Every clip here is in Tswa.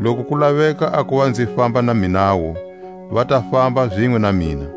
Loku ku laveka a kuva nzi famba na minawu, va ta famba zinwe na mina.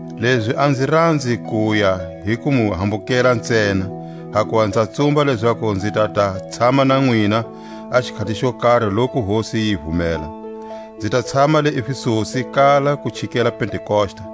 Lezi a nzi ranzi kuya hi ku mu hambukela ntsena, hakuva nza tsumba lezaku nzi ta ta tshama na nwina a xikhati xo kari loku Hosi yi vumela. Nzi ta tshama le Efesusi kala ku chikela Pentekosta;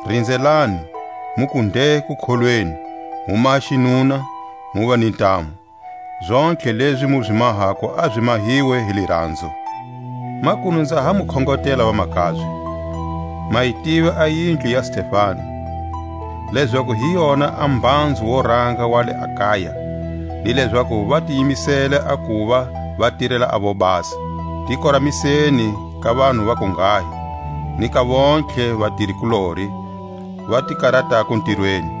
Rinzelani, muku nde kukholweni, mu maha xinuna, muva ni ntamu. Zontlhe lezi mu zi mahako a zi mahiwe hi liranzo. Makunu nza ha mu khongotela vamakabye: Ma yi tiva a yindlu ya Stefanasi, lezaku hi yona a mbhanzu wo ranga wa le Akaia, ni lezaku va ti yimisele a kuva va tirela a vobasa. Ti koramiseni ka vanhu va kunghahi, ni ka vontlhe vatiri-kulori, va ti karatako ntirweni.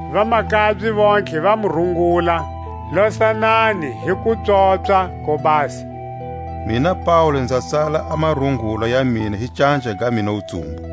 Vamakabye vontlhe va mu rungula. Losanani hi kupswopswa ko basa. Mina Paule nza tsala a marungula ya mina hi canja ga mina wutsumbu.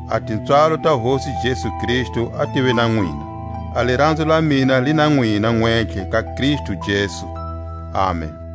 A tipswalo ta Hosi Jesu Kristu a tive na nwina. A liranzo la mina li na nwina nwentlhe ka Kristu Jesu. Amen.